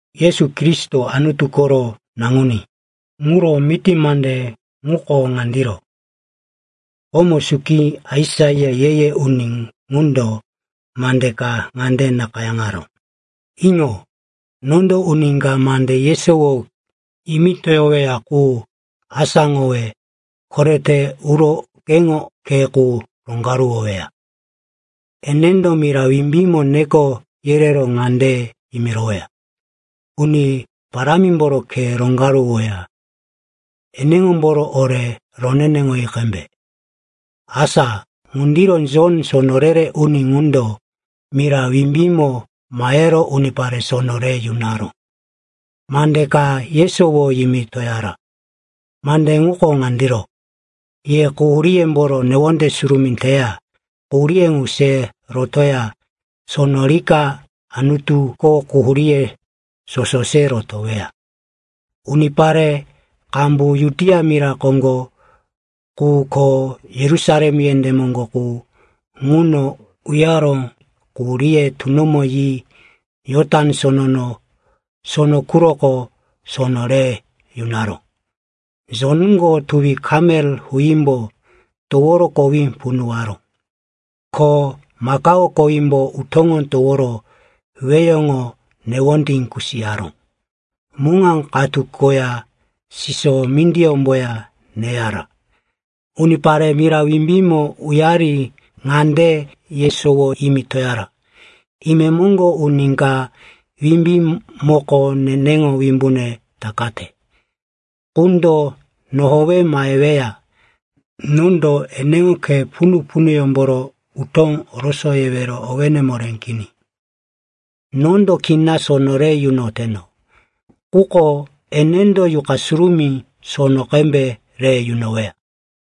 Yesu Kristo, Anutu koro Naŋuní, ŋuro miti mande ŋuko ŋandiro. Komo suki, Aisaia, ye-ye uni ŋundo, mande ka ŋande nakayáŋaró, “Iŋo, nondo uni ka mande yesowo yimitoyoweya qu asáŋowe koretero uro keŋo khe qu roŋgaruwoweya. Enendo mira wimbímo neko yerero ŋande yimiroweya, ‘Uni Parámimboro khe roŋgaruwoya, eneŋomboro ore roneneŋoyi qembe.’” Asa ŋundiro Jon, sono re-re uni ŋundo, mira wimbímo mahero unipare sono re yunoro mande ka yesowo yimitoyara. Mande ŋuko ŋandiro, “Ye quhuríyemboro newonde surumí teya quhurí ŋu se rotoya sono rika Anutuko quhuríye soso se rotoweya.” Unipare qambu Judia mira koŋgo qu ko Yerusalem yendé moŋgo qu ŋuno uyaro quhuríye tunomo yi Jotan Sono quroko sono re yunaró. Jonko tuwi kamel huímbo toworo kowí punuwaró. Ko makao kowímbo utóŋo toworo weheŋo newondí kusiyaró. Muŋa katu koya siso mindiyómboya neyara. Unipare mira wimbímo uyari ŋande yesowo yimitoyara, “Imemoŋgo uni ka wimbímboko nene wimbune takate qundo nohowe maheweya. Nondo eneŋo khe punu-punuyómboro utó orosoyewero owé moré kini. Nondo kina sono re yunoteno. Quko enendo Yuqa Surumí sono qembe re yunoweya.”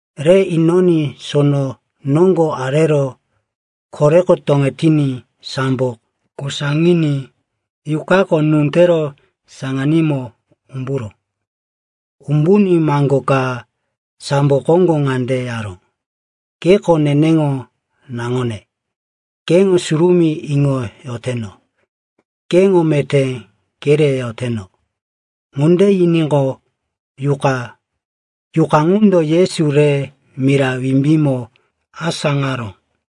Re inoní sono noŋgo arero koreko toŋetiní sambo kosaŋiní Yuqako nú tero saŋanímo umburó. Umbuní maŋgo ka sambo koŋgo ŋande yaró, “Keko neneŋo naŋone, keŋo surumí iŋoyoteno. Keŋo meté kereyoteno.” Ŋunde yiníqo, Yuqa ŋundo Yesu re mira wimbímo asáŋaró.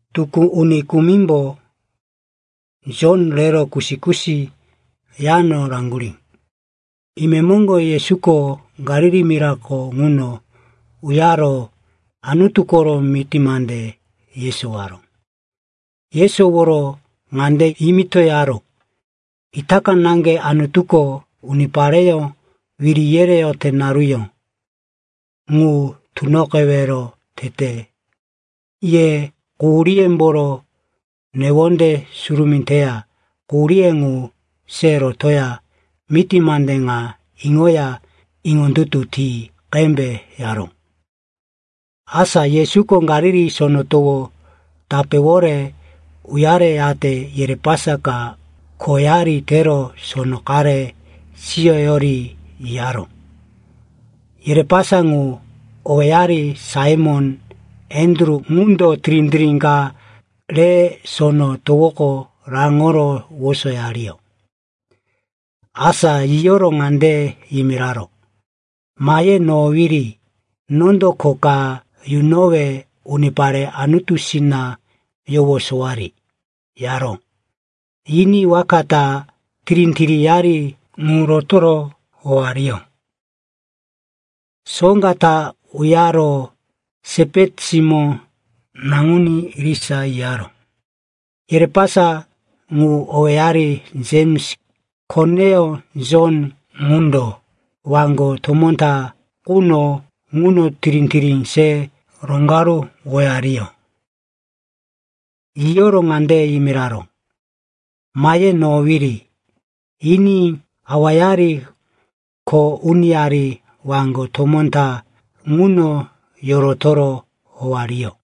Tukú uni kumimbo Jon rero kusi-kusi yano raŋgurí. Imemoŋgo Yesuko Galili mirako ŋuno uyaro Anutu koro miti mande yesowaró. Yesoworo ŋande yimitoyaró, “Itaka naŋge Anutuko unipareyó wiri yereyote naruyó ŋu tunoqewero tete. Ye quhuríyemboro newonde surumí teya quhurí ŋu se rotoya miti mande ŋa iŋoya iŋondutu ti qembe,” yaró. Asa Yesuko Galili Sono Towo tapéwore uyareyate yerepasa ka khoyari tero sono qare siyoyori yiyaró. Yerepasa ŋu, owéyari Saimon, Andru, ŋundo tirí-tirí ka re sono towoko raŋoro wosoyariyó. Asa yiyoro ŋande yimiraró, “Mahe nohowiri. Nondo kho ka yunowe unipare Anutusina yowosowari,” yaró. Yiní waka ta tirí-tiríyari ŋu rotoro howariyó. Soŋga ta uyaro Sepeti simó naŋuní irisa yiyaró. Yerepasa ŋu, owéyari Jems, koneyó Jon, ŋundo waŋgo tomó ta quno ŋuno tirí-tirí se roŋgaruwoyariyó. Yiyoro ŋande yimiraró, “Mahe nohowiri,” yiní awayari, kho uniyari waŋgo tomó ta ŋuno yorotoro howariyó.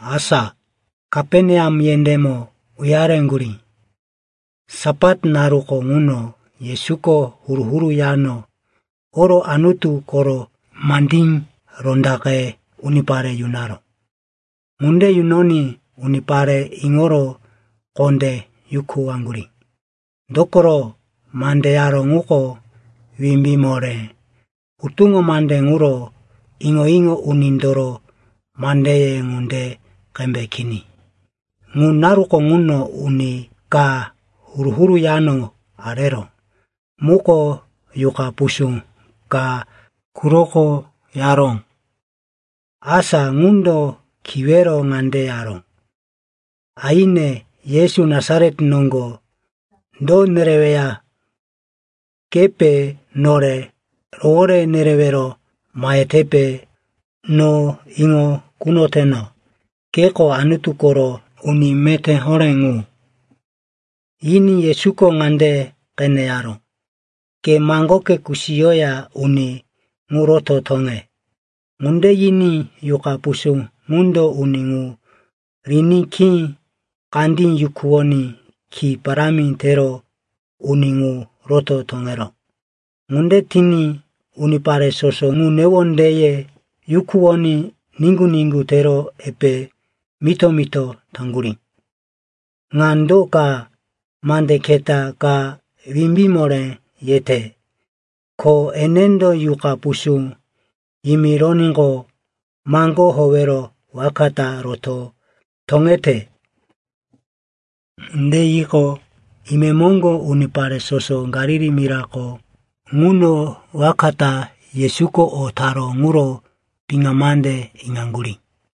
Asa Kaperneam yendémo uyareŋgurí. Sapat naruko ŋuno Yesuko huru-huru yano oro Anutu koro mandí rondaqe unipare yunaró. Ŋunde yunoní unipare iŋoro kondé yukuwaŋgurí. Dokoro mande yaró ŋuko wimbí moré, hutuŋo mande ŋuro iŋo-iŋo unindoro mandeye ŋunde qembe kini. Ŋu naruko ŋuno uni ka huru-huru yano areró muko yuqa pusú ka quroko yaró. Asa ŋundo kiwero ŋande yaró, “Aine, Yesu Nasaret noŋgo, do nereweya? Kepe nore rowore nerewero mahetepe? No iŋo kunoteno, keko Anutu koro uni meté horé ŋu.” Yiní Yesuko ŋande qene yaró, “Ke maŋgoke kusiyoya uni ŋu roto toŋe!” Ŋunde yiní yuqa pusú ŋundo uni ŋu riní khí kandí yukuwoní ki parámi tero uni ŋu roto toŋeró. Ŋunde tiní unipare soso ŋu newondeye yukuwoní niŋgu-niŋgu tero epe mito-mito taŋgurí, “Ŋa do ka? Mande keta ka wimbí moré yete! Ko enendo yuqa pusú yimironíqo, maŋgó howero waka ta roto toŋete!” Ŋunde yiqo, imemoŋgo unipare soso Galili mirako ŋuno waka ta Yesuko o taró ŋuro piŋa mande iŋaŋgurí.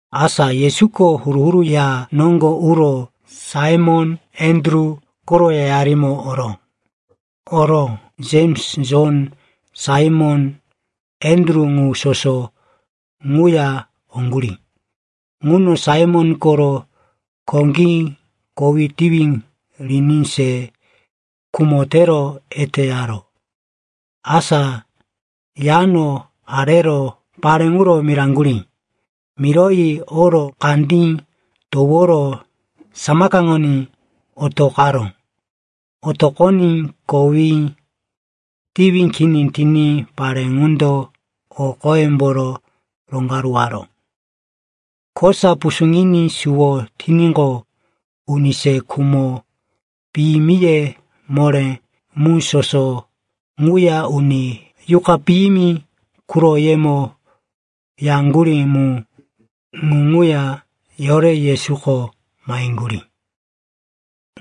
Asa Yesuko huru-huru ya noŋgo uro Saimon, Andru koro yayarimo oró. Oro Jems, Jon, Saimon, Andru ŋu soso ŋuya oŋgurí. Ŋuno Saimon koro koŋgí kowí tiwi riní se khumo tero eteyaró. Asa yano arero pare ŋuro miraŋgurí. Miroyi oro kandí toworo samakaŋoní otoqaró. Otoqoní kowí tiwi kini tiní pare ŋundo o qoyemboro roŋgaruwaró. Kosa pusuŋiní suwo tiníqo, uni se khumo piyimiye moré mu soso ŋuya uni yuqa piyimi quroyemo yaŋgurí mu, ŋu ŋuya yore Yesuko maheŋgurí.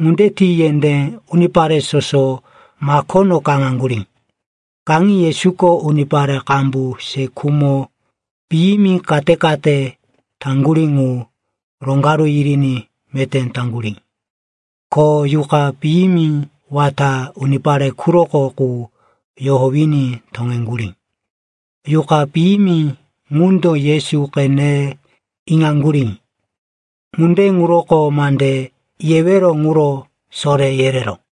Ŋunde ti yendé unipare soso makono kaŋaŋgurí. Kaŋi Yesuko unipare qambu se khumo piyimi kate-kate taŋgurí ŋu roŋgaru yiriní meté taŋgurí. Ko yuqa piyimi wata unipare quroko qu yohowiní toŋeŋgurí. Yuqa piyimi ŋundo Yesu qene iŋaŋgurí. Ŋunde ŋuroko mande yewero ŋuro soré yereró.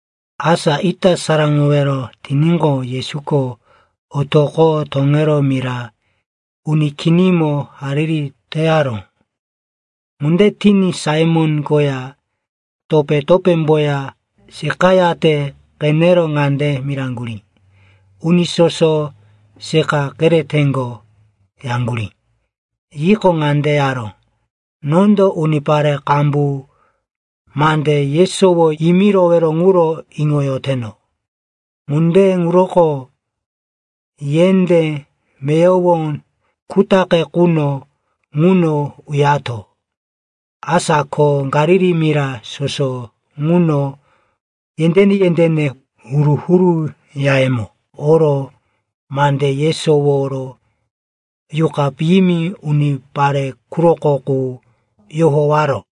Asa ita saraŋowero tiníqo, Yesuko otoqo toŋero mira uni kinimo hariri teyaró. Ŋunde tiní Saimon koya topé-topémboya seqayate qenero ŋande miraŋgurí, “Uni soso seqa kereteŋgo,” yaŋgurí. Yiqo, ŋande yaró, “Nondo unipare qambu mande yesowo yimirowero ŋuro iŋoyoteno. Ŋunde ŋuroko yendé meyowo kutaqe quno ŋuno uyato.” Asa ko Galili mira soso ŋuno yendéne-yendéne huru-huru yayemo oro mande yesoworo yuqa piyimi unipare quroko qu yohowaró.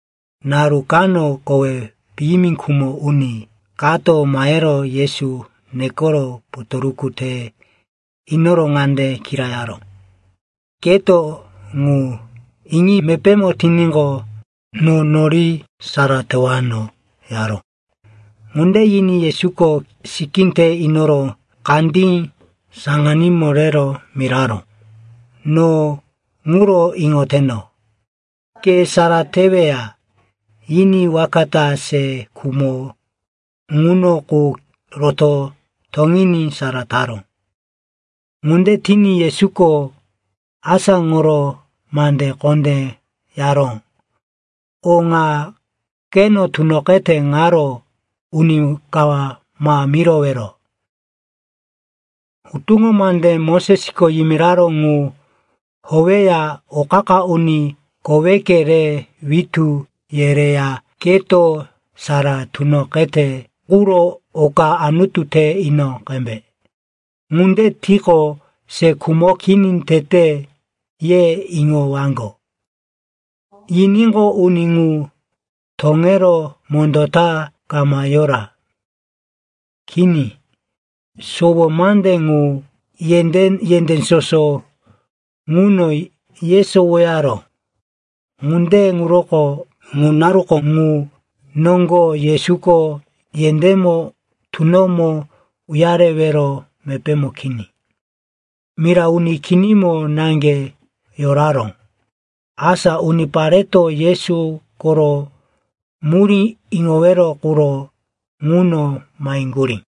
Naru kano kowí piyimi khumo uni kato mahero Yesu nekoro potoruku te inoro ŋande kirayaró, “Keto ŋu iŋi mepémo tiníqo, no nori sara tewano,” yaró. Ŋunde yiní Yesuko sikí te inoro kandí saŋanímo rero miraró, “No ŋuro iŋoteno. Ke sara teweya.” Yiní waka ta se khumo ŋuno qu roto toŋiní sara taró. Ŋunde tiní Yesuko asáŋoro mande kondé yaró, “O ŋa keno tunoqete ŋaro uni ka ma yimirowero. Hutuŋo mande Mosesko yimiraró ŋu howeya o qa-qa uni koweke re witú yereya keto sara tunoqete quro oka Anutu te ino qembe. Ŋunde tiqo, se khumoke kini tete, ye iŋowaŋgo.” Yiníqo, uni ŋu toŋero mondó ta kama yora. Kini, sowo mande ŋu yendé soso ŋuno yesowoyaró. Ŋunde ŋuroko ŋu naruko ŋu noŋgo Yesuko yendémo tunomo uyarewero mepémo kini, mira uni kinimo naŋge yoraró. Asa unipareto Yesu koro murí iŋowero quro ŋuno maheŋgurí.